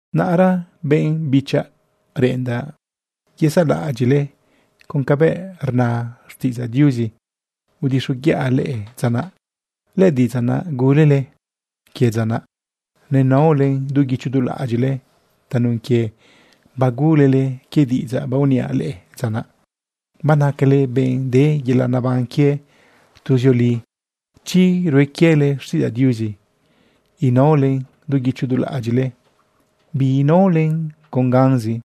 Naꞌra benꞌ bichaꞌ, reꞌendaꞌ yezaꞌlaꞌadyiꞌle con cabëꞌ rna xtiꞌidzaꞌ Diuzi udixoguiꞌa leꞌe dza naꞌ. Lëdiꞌidzaꞌ naꞌ gulele quien dza naꞌ nenaolen du guicho du laꞌadyiꞌle. Tanun quie bagulele quie diꞌidzaꞌ baoniaꞌ leꞌe dza naꞌ, banacale benꞌ de yelaꞌ neban quie tuzioli chi rue quiele xtiꞌidzaꞌ Diuzi inaolen du guicho du laꞌadyiꞌle, binaolen con ganzi.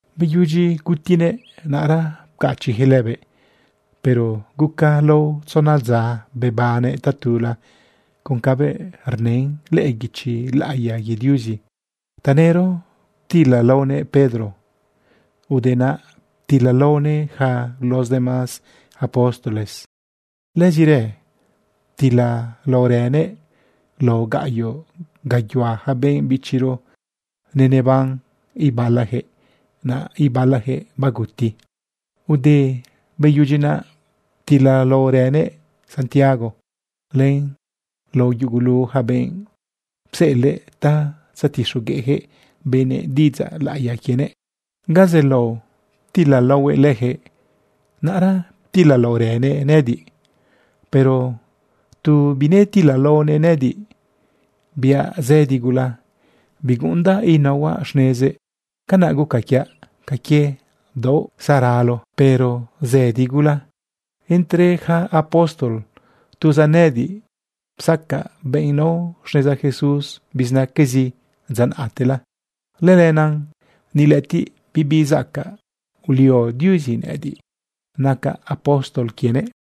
Beyudyi gutinëꞌ, naꞌra pcachiꞌyaquëꞌ lëbëꞌ. Pero guca lao tzona dza bebannëꞌ tatula con cabëꞌ rnën lëꞌë guichi laꞌiya quie Diuzi. Tanëro ptilalaonëꞌ Pedro. Ude naꞌ ptilalaonëꞌ yaca los demás apóstoles. Lëzirë ptilalaorënëꞌ lao gaꞌyoꞌ gayuhua yaca benꞌ bichiro. Neneban ibalajëꞌ, naꞌ ibalajëꞌ baguti. Ude beyudyi naꞌ ptilalaorënëꞌ Santiago len lao yugulu yaca benꞌ pseꞌelëꞌ ta tzetixogueꞌyaquëꞌ benëꞌ diꞌidzaꞌ laꞌiya quienëꞌ. Ga zelao ptilalaohuëꞌ leyaquëꞌ, naꞌra ptilalaorënëꞌ nëꞌëdiꞌ. Pero tu binetilalaonëꞌ nëꞌëdiꞌ, biaꞌ zëdi gula, biguꞌundaꞌ inaohuaꞌ xnezëꞌ. Canaꞌ guca quiaꞌ ca quie bdaoꞌ zaralo, pero zëdi gula. Entre yaca apóstol tuzaꞌ nëꞌëdiꞌ psacaꞌ benꞌ nao xneza Jesús bizinaquezi dza naꞌtela. Lëlenaꞌ ni lëꞌëtiꞌ bibi zacaꞌ ulio Diuzi nëꞌëdiꞌ nacaꞌ apóstol quienëꞌ.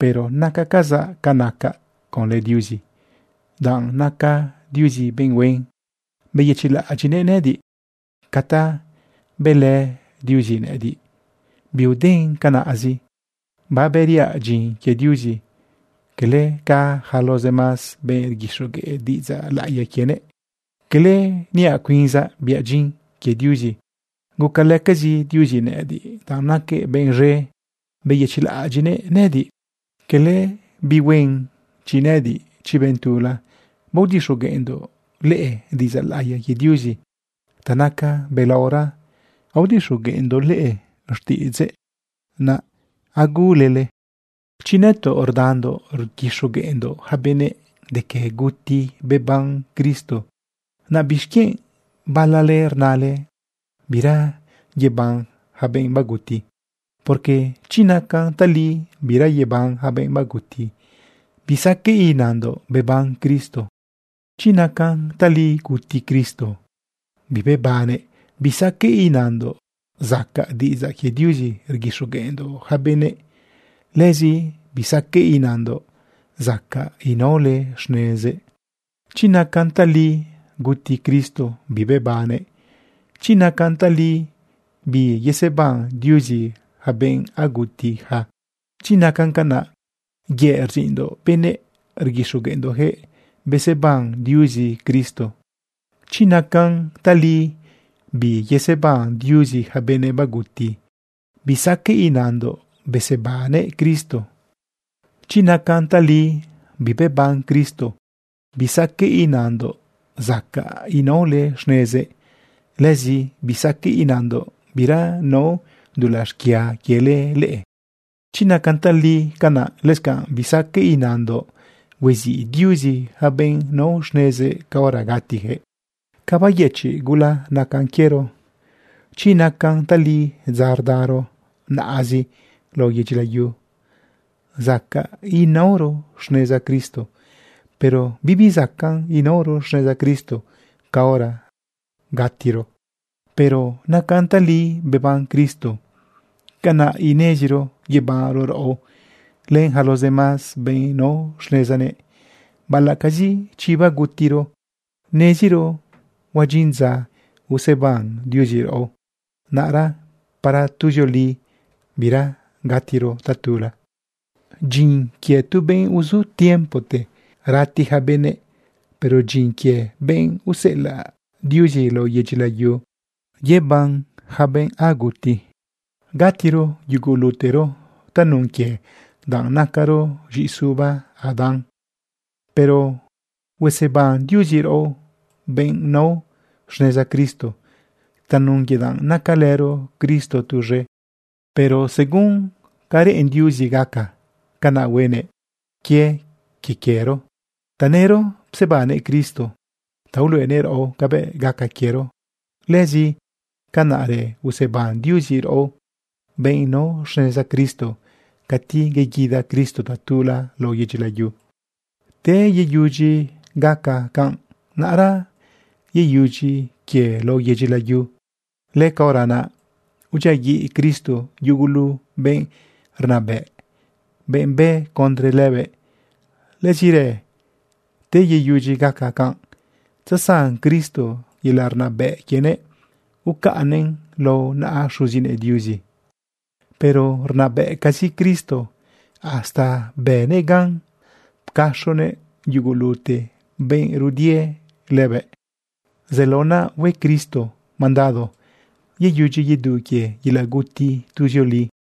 Pero nacacazaꞌ ca nacaꞌ conlë Diuzi, danꞌ naca Diuzi benꞌ huen, beyëchiꞌlaꞌadyiꞌnëꞌ nëꞌëdiꞌ. Ca ta bëlë Diuzi nëꞌëdiꞌ, biuden canaꞌzi. Babëriaꞌ dyin quie Diuzi cala ca yaca los demás benꞌ rguixogueꞌ diꞌidzaꞌ laꞌiya quienëꞌ. Cala niaꞌ cuinzaꞌ biaꞌ dyin quie Diuzi. Gucalëcazi Diuzi nëꞌëdiꞌ danꞌ naquëꞌ benꞌ z̃e beyëchiꞌlaꞌadyiꞌnëꞌ nëꞌëdiꞌ. Cala bihuen chi nëꞌëdiꞌ, chi benꞌ tula, baodixogueꞌndoꞌ leꞌe diꞌidzaꞌ laꞌiya quie Diuzi. Ta naca belaora udixogueꞌndoꞌ leꞌe xtiꞌidzëꞌ, naꞌ agulele. Chi nëtoꞌ rdandoꞌ rguixogueꞌndoꞌ yaca benëꞌ de que guti beban Cristo ¿naꞌa bixquienꞌ balale rnale bira yeban yaca benꞌ baguti? Porque chi nacan tali bira yeban yaca benꞌ baguti, bisaqueꞌ inandoꞌ beban Cristo. Chi nacan tali guti Cristo bibebannëꞌ, bisaqueꞌ inandoꞌ zacaꞌ diꞌidzaꞌ quie Diuzi rguixogueꞌndoꞌ yaca benëꞌ, lëzi bisaqueꞌ inandoꞌ zacaꞌ inaole xnezëꞌ. Chi nacan tali guti Cristo bibebannëꞌ, chi nacan tali biyeseban Diuzi yaca benꞌ aguti yaca, chi nacan canaꞌ, yëꞌ rziꞌndoꞌ benëꞌ rguixogueꞌndoꞌyaquëꞌ beseban Diuzi Cristo. Chi nacan tali biyeseban Diuzi yaca benëꞌ baguti, bisaqueꞌ inandoꞌ besebannëꞌ Cristo. Chi nacan tali bibeban Cristo, bisaqueꞌ inandoꞌ zacaꞌ inaole xnezëꞌ, lëzi bisaqueꞌ inandoꞌ bira nao dulaꞌ xquia quiele leꞌe. Chi nacan tali canaꞌ, lëscanꞌ bisaqueꞌ inandoꞌ huaziꞌ Diuzi yaca benꞌ nao xnezëꞌ caora gatiyaquëꞌ. Ca bayëchiꞌ gula nacan quiero, chi nacan tali dza rdaro naꞌazi lao yedyi layu zacaꞌ inaoro xneza Cristo, pero bibi zacaꞌn unaoro xneza Cristo caora gatiro. Pero nacan tali beban Cristo. Canaꞌ ineziro yebanro raꞌo len yaca los demás benꞌ nao xnezanëꞌ. Baꞌalaꞌcazi chi bagutiro, neziro huadyin dza useban Diuzi raꞌo. Naꞌra para tuzioli bira gatiro tatula. Dyin quie tu benꞌ uzu tiempote rati yaca benëꞌ. Pero dyin quie benꞌ useꞌelaꞌ Diuzi lao yedyi layu yeban yaca benꞌ guti. Gatiro yugulutero tanun quie danꞌ nacaro z̃iꞌisuba Adán. Pero yeseban Diuzi raꞌo, benꞌ nao xneza Cristo, tanun quie danꞌ nacalëro Cristo tuz̃e. Pero según ca reꞌen Diuzi gaca, canaꞌ huenëꞌ quie quiero. Tanëro psebannëꞌ Cristo ta uluꞌenëꞌ raꞌo cabëꞌ gaca quiero. Lëzi canaꞌrë useban Diuzi raꞌo, benꞌ nao xneza Cristo, cati yeguida Cristo tatula lao yedyi layu. Te yeyudyi gaca canꞌ, naꞌra yeyudyi quie lao yedyi layu. Lëcaora naꞌ udyiaguiꞌ Cristo yugulu benꞌ rnabëꞌ, benꞌ bë condre lëbëꞌ. Lëzirë te yeyudyi gaca canꞌ, tzesan Cristo yelaꞌ rnabëꞌ quienëꞌ ucaꞌnnëꞌn lao naꞌa Xuzinëꞌ Diuzi. Pero rnabëꞌcazi Cristo hasta bënëꞌ gan pcaxonëꞌ yugulute benꞌ rudie lëbëꞌ. Zeꞌlao naꞌ hue Cristo mandado yeyudyi yedu quie yelaꞌ guti tuzioli.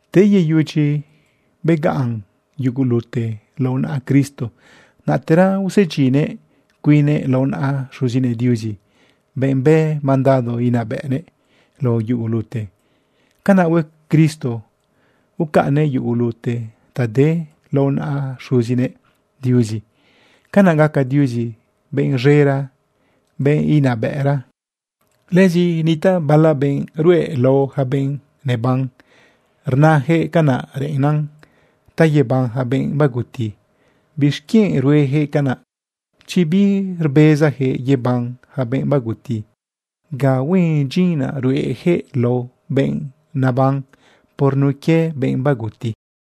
Te yeyudyi begaꞌn yugulute lao naꞌa Cristo, naꞌtera usedyinnëꞌ cuinnëꞌ lao naꞌa Xuzinëꞌ Diuzi, benꞌ bë mandado inabëꞌnëꞌ lao yugulute. Canaꞌ hue Cristo ucaꞌnnëꞌ yugulute ta de lao naꞌa Xuzinëꞌ Diuzi. Canaꞌ gaca Diuzi benꞌ z̃era, benꞌ inabëꞌra. Lëzi nitaꞌ bala benꞌ ruꞌe lao yaca benꞌ neban rnayaquëꞌ canaꞌ reꞌennan ta yeban yaca benꞌ baguti. ¿Bixquienꞌ rueyaquëꞌ canaꞌ? Chi birbezayaquëꞌ yeban yaca benꞌ baguti, ¿ga huen dyin ruꞌeyaquëꞌ lao benꞌ neban por nun quie benꞌ baguti?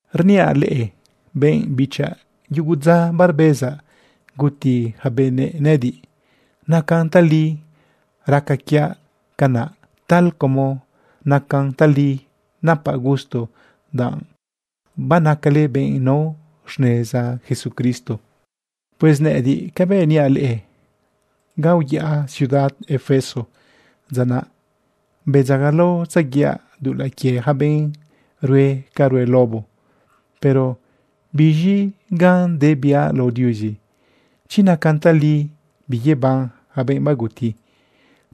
Rniaꞌ leꞌe, benꞌ bichaꞌ, yugu dza barbezaꞌ guti yaca benëꞌ nëꞌëdiꞌ. Nacan tali raca quiaꞌ canaꞌ tal como nacan tali napaꞌ gusto danꞌ banacale benꞌ nao xneza Jesucristo. Pues nëꞌëdiꞌ cabëꞌ niaꞌ leꞌe ga uyaꞌa ciudad Efeso dza naꞌ, bedzagalaotzeguiaꞌ dulaꞌ quie yaca benꞌ rue ca rue lobo. Pero ¿biz̃i gan de biaꞌ lao Diuzi chi nacan tali biyeban yaca benꞌ baguti?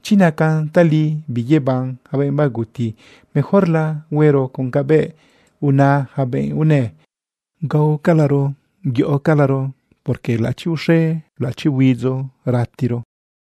Chi nacan tali biyeban yaca benꞌ baguti, mejorla huero con cabëꞌ una yaca benꞌ unë: “Gaocalaro yoꞌocalaro, porque laꞌachi uxe, laꞌachi huidzo, ratiro.”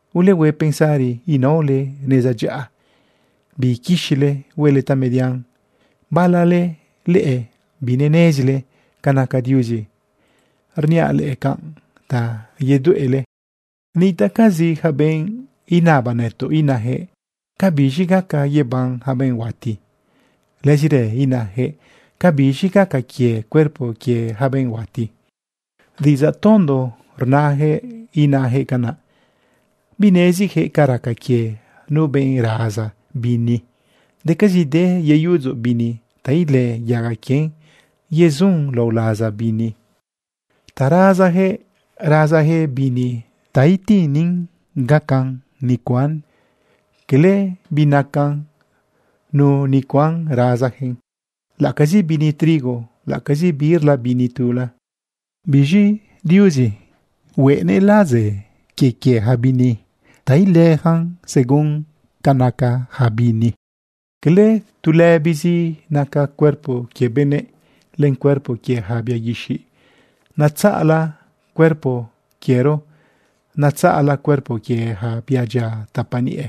Ulehue pensari inaole neza dyaꞌa. Biiquixile huele tamedian. Balale leꞌe binenezile ca naca Diuzi. Rniaꞌ leꞌe canꞌ ta yedueꞌle. Nitaꞌcazi yaca benꞌ inaba nëtoꞌ inayaquëꞌ: “¿Cabiz̃i gaca yeban yaca benꞌ huati?” Lëzirë inayaquëꞌ: “¿Cabiz̃i gaca quie cuerpo quie yaca benꞌ huati?” Diꞌidzaꞌ tondo rnayaquëꞌ inayaquëꞌ canaꞌ. Bineziyaquëꞌ ca raca quie nu benꞌ raza bini. Decazide yeyuꞌudzoꞌ bini ta ilë yaga quien yezun lao laza bini. Ta razayaquëꞌ, razayaquëꞌ bini ta itinin gacan nicuan. Cala binacan nu nicuan razayaquëꞌ, laꞌacazi bini trigo, laꞌacazi birla bini tula. Biz̃i Diuzi hueꞌnëꞌ laze quie quie yaca bini ta ilëyacan según ca naca yaca bini. Cala tu lëbizi naca cuerpo quie benëꞌ len cuerpo quie yaca bia guixiꞌ. Netzaꞌla cuerpo quiero. Netzaꞌla cuerpo quie yaca bia dyia tapa niꞌe.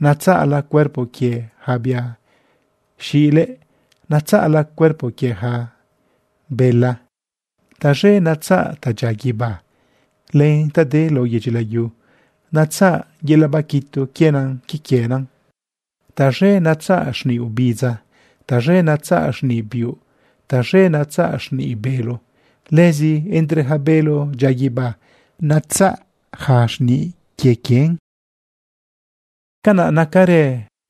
Netzaꞌla cuerpo quie yaca bia xile. Netzaꞌla cuerpo quie yaca bela. Taz̃e netzaꞌ ta dyia guibá len ta de lao yedyi layu. Netzaꞌ yelaꞌ baquitu quienan quie quienan. Taz̃e netzaꞌ xniꞌ obidza. Taz̃e netzaꞌ xniꞌ biuꞌ. Taz̃e netzaꞌ xniꞌ bélo. Lëzi entre yaca bélo dyia guibá, netzaꞌ yaca xniꞌ quie quien. Canaꞌ nacarë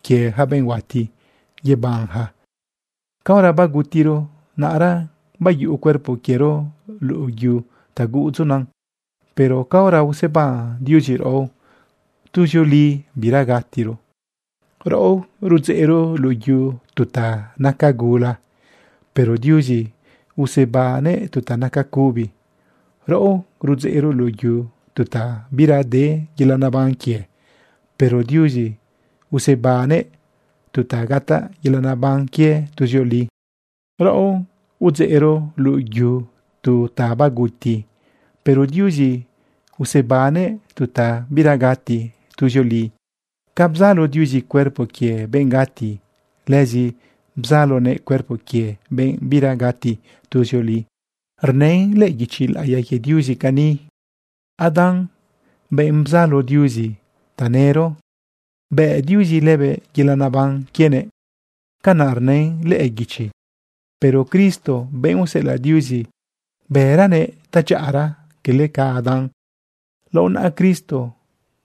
quie yaca benꞌ huati yeban yaca. Caora bagutiro, naꞌra bayuꞌu cuerpo quiero luꞌu yu ta guꞌudzona. Pero caora useban Diuzi raꞌo, tuzioli bira gatiro. Raꞌo rudzeꞌro luꞌu yu tu ta naca gula. Pero Diuzi usebannëꞌ tu ta naca cubi. Raꞌo rudzeꞌro luꞌu yu tu ta bira de yelaꞌ neban quie. Pero Diuzi usebannëꞌ tu ta gataꞌ yelaꞌ neban quie tuzioli. Raꞌo udzeꞌro luꞌu yu tu ta baguti. Pero Diuzi usebannëꞌ tu ta bira gati tuzioli. Ca bzalo Diuzi cuerpo quie benꞌ gati, lëzi bzaloguëꞌ cuerpo quie benꞌ bira gati tuzioli. Rnën lëꞌë guichi laꞌiya quie Diuzi cani: “Adán, benꞌ bzalo Diuzi tanëro, bëꞌ Diuzi lëbëꞌ yelaꞌ naban quienëꞌ.” Canaꞌ rna lëꞌë guichi. Pero Cristo, benꞌ useꞌelaꞌ Diuzi, bëranëꞌ tadyaꞌara cala ca Adán. Lao naꞌa Cristo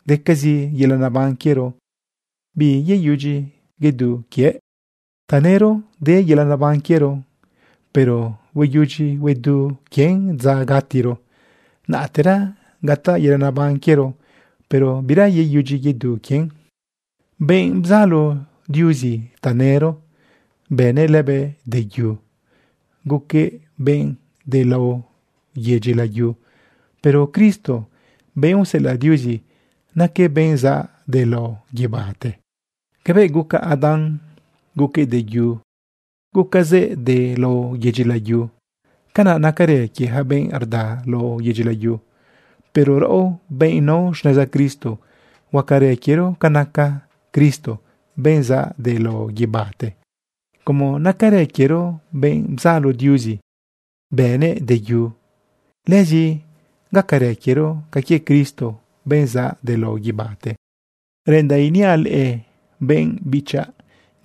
decazi yelaꞌ naban quiero biyeyudyi yedu quie. Tanëro de yelaꞌ neban quiero, pero hueyudyi huedu quien dza gatiro. Naꞌtera gataꞌ yelaꞌ neban quiero, pero bira yeyudyi yedu quien. Benꞌ bzalo Diuzi tanëro bëguëꞌ lëbëꞌ de yu. Guquëꞌ benꞌ de lao yedyi layu. Pero Cristo, benꞌ useꞌelaꞌ Diuzi, naquëꞌ benꞌ zaꞌ de lao guibáte. Cabëꞌ guca Adán guquëꞌ de yu, gucacazëꞌ de lao yedyi layu, canaꞌ nacarë quie yaca benꞌ rda lao yedyi layu. Pero raꞌo, benꞌ nao xneza Cristo, huacarë quiero ca naca Cristo, benꞌ zaꞌ de lao guibáte. Como nacarë quiero benꞌ bzalo Diuzi bëguëꞌ de yu, lëzirë gacarë quiero ca quie Cristo, benꞌ zaꞌ de lao guibáte. Reꞌendaꞌ iniaꞌ leꞌe, benꞌ bichaꞌ,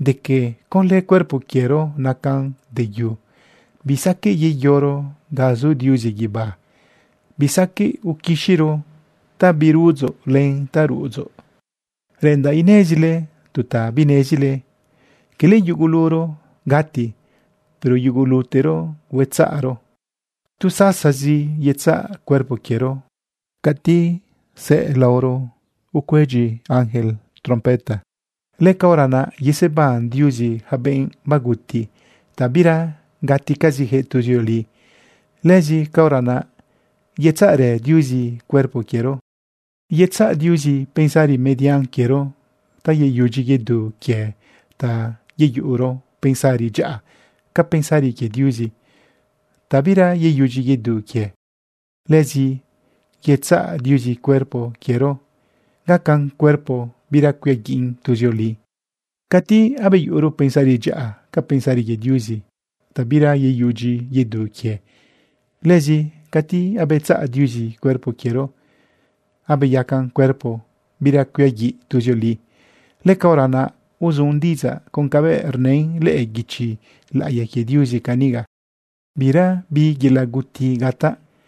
de que conlë cuerpo quiero nacan de yu, bisaqueꞌ yeyoro ga zu Diuzi guibá. Bisaqueꞌ uquixiro ta biruꞌudzo len ta ruꞌudzo. Reꞌendaꞌ inezile tu ta binezile. Cala yuguluro gati, pero yugulutero huetzaꞌro. Tu sasazi yetzaꞌ cuerpo quiero cati zeꞌlao yero ucuedyi ángel trompeta. Lëcaora naꞌ yeseban Diuzi yaca benꞌ baguti ta bira gaticaziyaquëꞌ tuzioli. Lëzi caora naꞌ yetzaꞌrë Diuzi cuerpo quiero. Yetzaꞌ Diuzi pensari median quiero ta yeyudyi yedu quie, ta yeyuꞌuro pensari dyaꞌa ca pensari quie Diuzi ta bira yeyudyi yedu quie. Lëzi yetzaꞌ Diuzi cuerpo quiero hueyacan cuerpo bira cuiaguiꞌn tuzioli. Cati abeyuꞌuro pensari dyaꞌa ca pensari quie Diuzi ta bira yeyudyi yedu quie, lëzi cati abetzaꞌ Diuzi cuerpo quiero beyacan cuerpo bira cuiaguiꞌn tuzioli, lëcaora naꞌ uzun diꞌidzaꞌ con cabëꞌ rnën leꞌe guichi laꞌiya quie Diuzi cani: “Birabi yelaꞌ guti gataꞌ.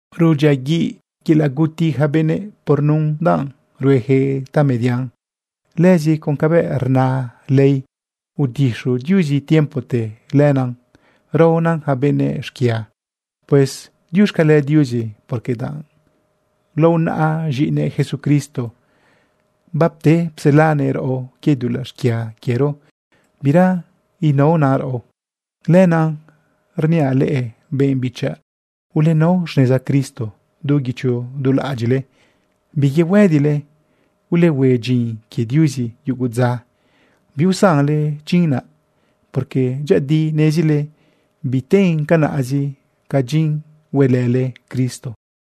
Rudyiaguiꞌ yelaꞌ guti yaca benëꞌ por nun danꞌ rueyaquëꞌ tamedian. Lëzi con cabëꞌ rna ley udixu Diuzi tiempote, lenaꞌ raona yaca benëꞌ xquia. Pues diuxcale Diuzi, porque danꞌ lao naꞌa z̃iꞌinëꞌ Jesucristo, bapte pselanëꞌ raꞌo quie dulaꞌ xquia quiero, bira inaona raꞌo. Lenaꞌ niaꞌ leꞌe, benꞌ bichaꞌ, ulenao xneza Cristo du guicho du laꞌadyiꞌle, biyehuëdile. Ulehue dyin quie Diuzi yugo dza. Biusanle dyin naꞌ, porque dyëꞌëdi nezile biten canaꞌzi ca dyin huelële Cristo.